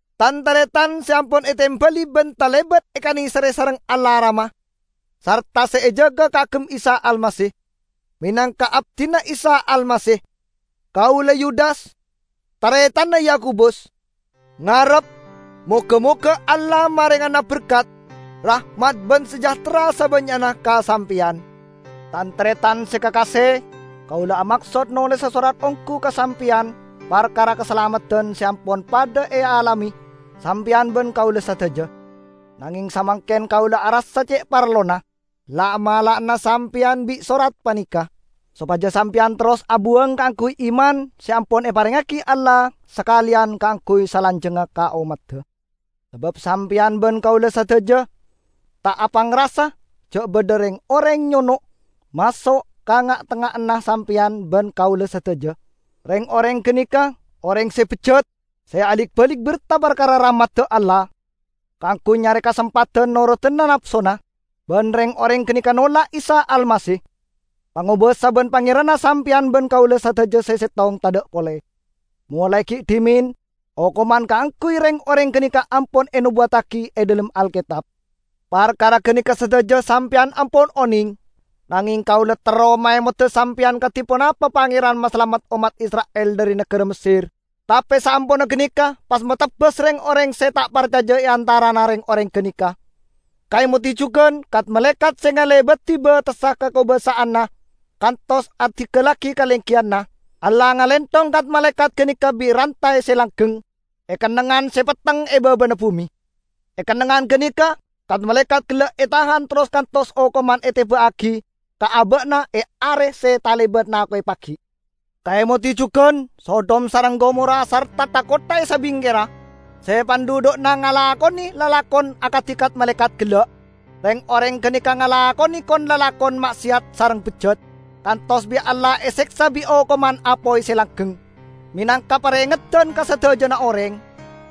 Tan-taretan se ampon etembali ban talebat ekaneserre sareng Allah Rama, sarta se ejaga kaagem Isa Almasih. Menangka abdina Isa Almasih, kaula -- Yudas -- taretanna Yakobus, ngarep: Moga-moga Allah marengana berkat, rahmat ban sejahtera sabannya'na ka sampeyan. Tan-taretan se kakase! Kaula amaksod nolesa sorat onggu ka sampeyan parkara kasalameddan se ampon padha ealame sampeyan ban kaula sadaja. Nangeng samangken kaula arassa ce' parlona la'-mala'ana sampeyan bi' sorat paneka, sopaja sampeyan terros abuwang kaangguy iman se ampon eparengngagi Allah sakaleyan kaangguy salanjangnga ka ommadda. Sabab sampeyan ban kaula sadaja ta' apangrasa ja' badha reng-oreng nyono' maso' ka nga'-tengnga'anna sampeyan ban kaula sadaja. Reng-oreng ganeka oreng se bejjat, se alik-balik berta parkara rahmadda Allah, kaangguy nyare kasempadan norodana napsona. Ban reng-oreng ganeka nolak Isa Almasih, Pangobasa ban Pangeranna sampeyan ban kaula sadaja se settong tadha' pole. Molae gi' dhimen okoman kaangguy reng-oreng ganeka ampon enobuwattagi e dhalem Alketab. Parkara ganeka sadaja sampeyan ampon oneng. Nangeng kaula terro maemoda sampeyan kadi ponapa Pangeran masalamet ommat Isra'il dhari nagara Messer, tape saamponna ganeka pas matebas reng-oreng se ta' parcaja e antarana reng-oreng ganeka. Kaemodi jugan kat-malaekat se ngalebadi batessa kakobasa'anna kantos adinggallagi kalenggiyanna. Allah ngalenthong kat-malaekat ganeka bi' rantay se langgeng, e kennengngan se petteng e babana bume. E kennengngan ganeka kat-malaekat gella' etahan terros kantos okoman eteba'agi ka aba'na e Are se talebat nako'e pagi'. Kaemodi jugan Sodom sareng Gomora sarta tha-kottha e sabingkerra, se pandhudhu'na ngalakone lalakon akadi kat-malaekat gella'. Reng-oreng ganeka ngalakone kon-lalakon ma'seyat sareng bejjat, kantos bi' Allah eseksa bi' okoman apoy se langgeng, menangka parengeddan ka sadajana oreng.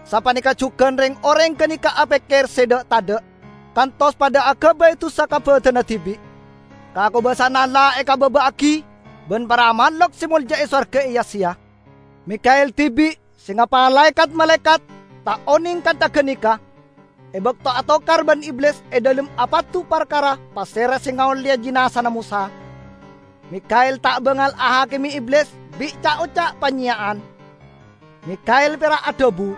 Sapaneka jugan reng-oreng ganeka apekker se dha'-tadha' kantos padha agabay dusa ka badanna dibi'. Kakobasa'anna Allah ekababa'agi ban para mahlok se molja e sowarga eya-seya. Mikha'el dibi', se ngapalae kat-malaekat, ta' oneng kantha ganeka. E bakto atokar ban Iblis e dhalem apadu parkara pasera se ngaolleya jinazana Mosa, Mikha'el ta' bangal ahakime Iblis bi' ca'-oca' panyeya'an. Mikha'el pera' adhabu,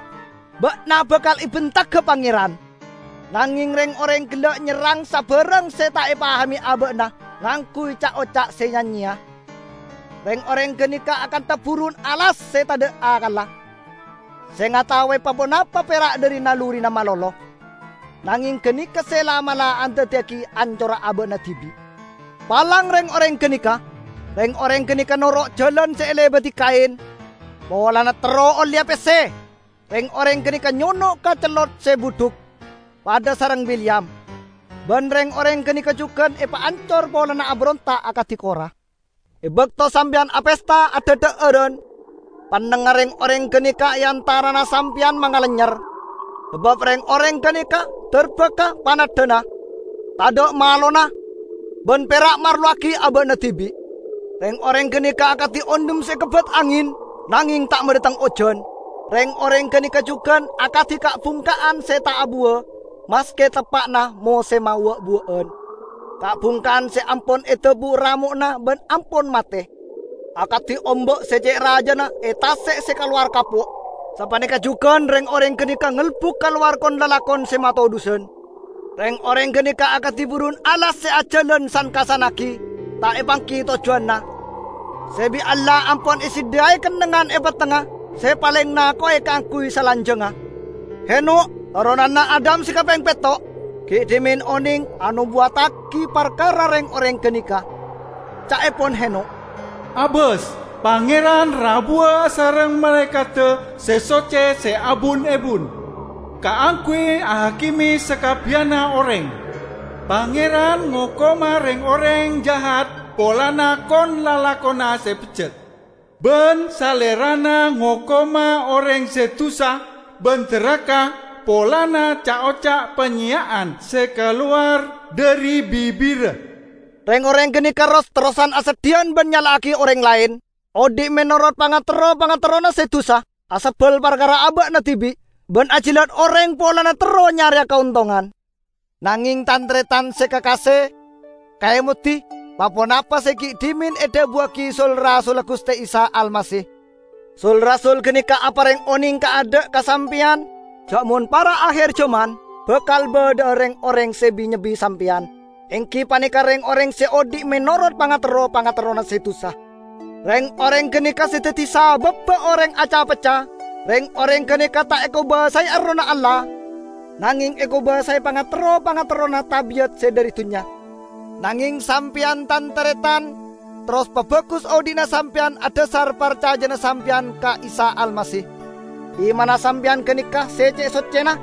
"Ba'na bakal ebentaga Pangeran!" Nangeng reng-oreng gella' nyerrang sabarang se ta' epahame aba'na ngangguy ca'-oca' se ya-nyeya. Reng-oreng ganeka akantha burun alas se tadha' akkalla, se ngataowe pa-ponapa pera' dhari nalurina malolo. Nangeng ganeka se la'-mala' andaddiyagi ancorra aba'na dibi'. Palang reng-oreng ganeka! Reng-oreng ganeka noro' jalan se elebadi Kain. Polana terro olleya pesse, reng-oreng ganeka nyono' ka cellot se budhuk, padha sareng Bileyam. Ban reng-oreng ganeka jugan epaancor polana aberonta' akadi Korah. E bakto sampeyan apesta adhadha'aran, pannengnga reng-oreng ganeka e antarana sampeyan mangalennyer. Sabab reng-oreng ganeka darbaka paneddhana, tadha' malona, ban pera' marlowagi aba'na dibi'. Reng-oreng ganeka akadi ondhem se ekebbat angen, nangeng ta' madhateng ojan. Reng-oreng ganeka jugan akadi ka'-bungka'an se ta' abuwa maske teppa'na mosemma wa'-buwa'an; ka'-bungka'an se ampon edabu' ramo'na ban ampon mate. Akadi omba' se ce' rajana e tase' se kalowar kapo', sapaneka jugan reng-oreng ganeka ngelbuk kalowar kon-lalakon se matodhusan. Reng-oreng ganeka akadi burun alas se ajalan san-kassannagi ta' epanggi tojjuwanna, se bi' Allah ampon esadhiyai kennengngan e pettengnga se paleng nako'e kaangguy salanjangnga. Henokh, toronanna Adam se kapeng petto', gi' dhimen oneng anobuwaddagi parkara reng-oreng ganeka. Ca'epon Henokh, "Abas, Pangeran rabuwa asareng malaekadda se socce se abun-ebun kaangguy ahakime sakabbiyanna oreng. Pangeran ngokoma reng-oreng jahat polana kon-lalakonna se bejjat. Ban Salerana ngokoma oreng se dusa ban daraka polana ca'-oca' panyeya'an se kalowar dhari bibirra." Reng-oreng ganeka ros-terrosan aseddhiyan ban nyala'agi oreng laen; odhi' menorot pangaterro-pangaterrona se dusa. Asebbal parkara aba'na dibi', ban ajilat oreng polana terro nyareya kaontongan. Nangeng tan-taretan se kakase, kaemodi pa-ponapa se gi' dhimen edhabuwagi sul-rasulla Guste Isa Almasih. Sul-rasul ganeka apareng oneng kaadha' ka sampeyan ja' mon para' aher jaman bakal badha'a reng-oreng se bi-nyebbi sampeyan, enggi paneka reng-oreng se odhi' menorot pangaterro-pangaterrona se dusa. Reng-oreng ganeka se daddi sababba oreng aca-pecca. Reng-oreng ganeka ta' ekobasae Errohna Allah, nangeng ekobasae pangaterro-pangaterrona tabi'at se dhari dunnya. Nangeng, sampeyan, tan-taretan, terros pabagus odhi'na sampeyan adhasar parcajana sampeyan ka Isa Almasih. Imanna sampeyan ganeka ce' soccena.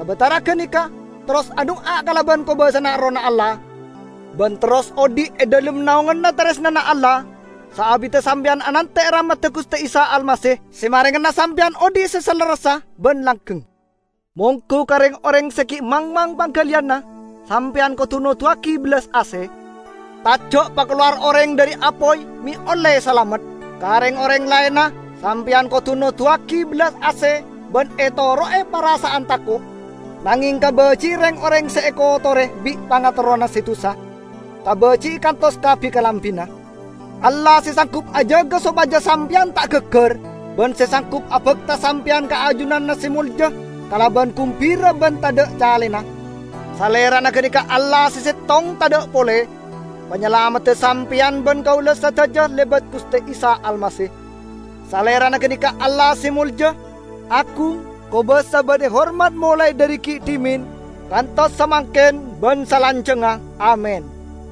Sabatara ganeka, terros adu'a kalaban kobasana Errohna Allah, ban terros odhi' e dhalem naonganna taresnana Allah saabidda sampeyan anante' rahmadda Guste Isa Almasih, se marengana sampeyan odhi' se salerressa ban langgeng. Monggu ka reng-oreng se gi' mangmang panggaliyanna, sampeyan kodu noduwagi bellas ase. Taja' pakalowar oreng dhari apoy me' olle salamet. Ka reng-oreng laenna sampeyan kodu noduwagi bellas ase ban etoro'e parasa'an tako'; nangeng kabaji'i reng-oreng se ekotore bi' pangaterrona se dusa, kabaji'i kantos ka bi-kalambina. Allah, se sanggup ajaga sopaja sampeyan ta' gaggar, ban se sanggup abakta sampeyan ka ajunanna se molja kalaban gumbira ban tadha' calena, Salerana ganeka Allah se settong tadha' pole, Panyalamedda sampeyan ban kaula sadaja lebat Guste Isa Almasih. Salerana ganeka Allah se molja, agung, kobasa ban ehormat molae dhari gi' dhimen kantos samangken ban salanjangnga! Amin.